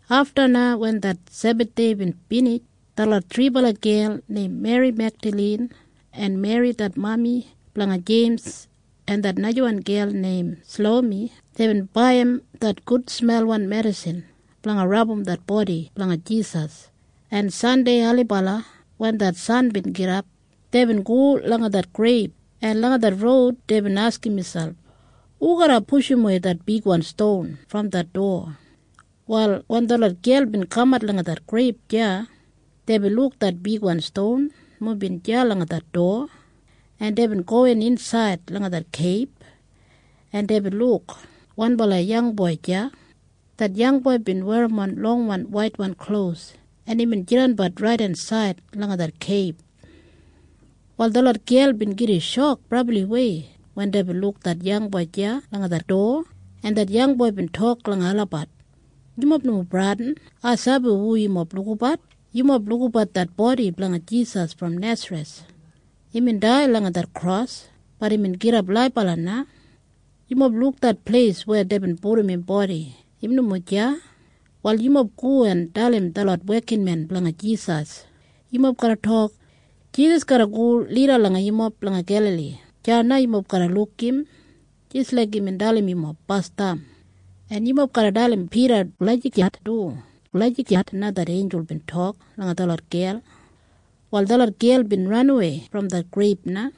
Afta na wen det Sebathdei bin binij, detlot thribala gel neim Meri Megdalin en Meri det mami blanga Jeims en det najawan gel neim Salomi, deibin baiyim det gudsmelwan medisin blanga rabum det bodi blanga Jisas, en Sandei ailibala wen det san bin gidap, deibin go langa det greib, en langa roud deibin askim miselp, “Hu garra pushumwei det bigwan ston brom det dowa?” Wal wen detlot gel bin kamat langa det greib deya, deibin luk det bigwan ston nomo bin deya langa det dowa, en deibin gowin insaid langa det keib. En deibin luk wanbala yangboi deya hubin werrimon longwan waitwan klos, en imbin jidanbat raidensaid langa det keib. Wal detlot gel bin gida shok brabliwei wen deibin luk im deya langa det dowa, en imbin tok langa olabat, “Yumob nomo bradin. Ai sabi hu yumob lukabat. Yumob lukabat det bodi blanga Jisas brom Nesareth. Imbin dai langa det kros. Bat imbin gidap laibala na. Yumob luk det pleis weya deibin pudum im bodi. Im nomo deya. Wal yumob go en dalim detlot wekinmen blanga Jisas. Yumob garra tok, ‘Jisas garra go lida langa yumob langa Gelali. Deya na yumob garra luk im jis laik imbin dalim yumob basdam.’ En yumob garra dalim Pida lagijat du.” Lagijat na det einjul bin tok langa detlot gel. Wal detlot gel bin ranawei brom det greib na,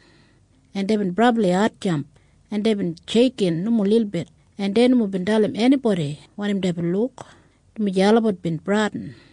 en deibin brabli hatjamp, en deibin sheiksheik nomo lilbit, en dei nomo bin dalim enibodi wanim deibin luk, dumaji olabat bin bradin.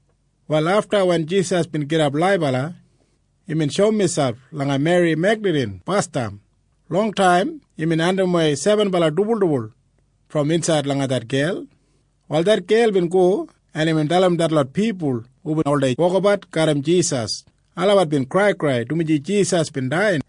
Wal afta wen Jisas bin gidap laibala, imbin shoum miselp langa Meri Megdalin basdam. Longtaim Jisas bin andimwei sebenbala dibuldibul brom insaid langa det gel. Wal Meri bin go en dalim detlot pipul hubin oldei wokabat garram Jisas. Olabat bin kraikrai dumaji Jisas bin dai,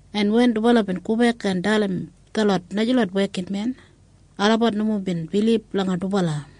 Afta wen dubala bin gobek en dalim detlot najalot wekinmen, olabat nomo bin bilib langa dubala.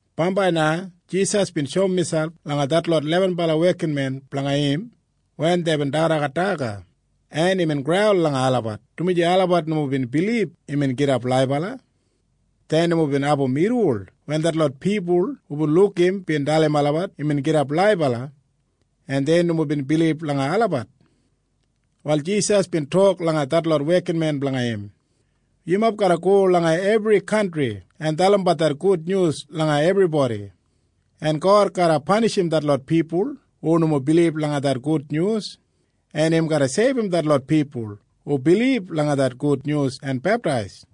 Bambai na Jisas bin shoum miselp langa detlot lebenbala wekinmen blanga im wen deibin dagadagat daga. Imbin graul langa olabat, dumaji olabat nomo bin bilib imbin gidap laibala. Dei nomo bin abum irriwol wen detlot pipul hubin luk im bin dalim olabat imbin gidap laibala, en dei nomo bin bilib langa olabat. Wal Jisas bin tok langa detlot wekinmen blanga im, “Yumob go langa ebri kantri en dalimbat det gudnyus langa ebribodi. “En God garra panishim detlot pipul hu nomo bilib langa det gudnyus, en im garra seibum detlot pipul hu bilib langa det gudnyus en beptais.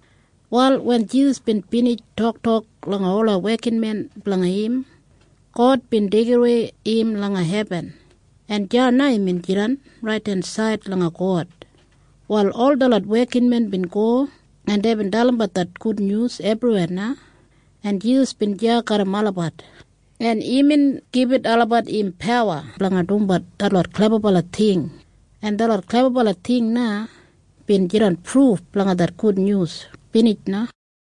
Wal wen Jisas bin binij toktok langa im wekinmen olabat, God bin deigidawei im langa hebin, en deya na im jidan raidensaid langa God. Wal ol detlot wekinmen bin go, en deibin dalimbat det gudnyus ebriweya na, en Jisas bin deya garram olabat, en imbin gibit olabat im pawa blanga dumbat detlot klebabala ting, en detlot klebabala ting na bin jidan pruf blanga det gudnyus. Binij na.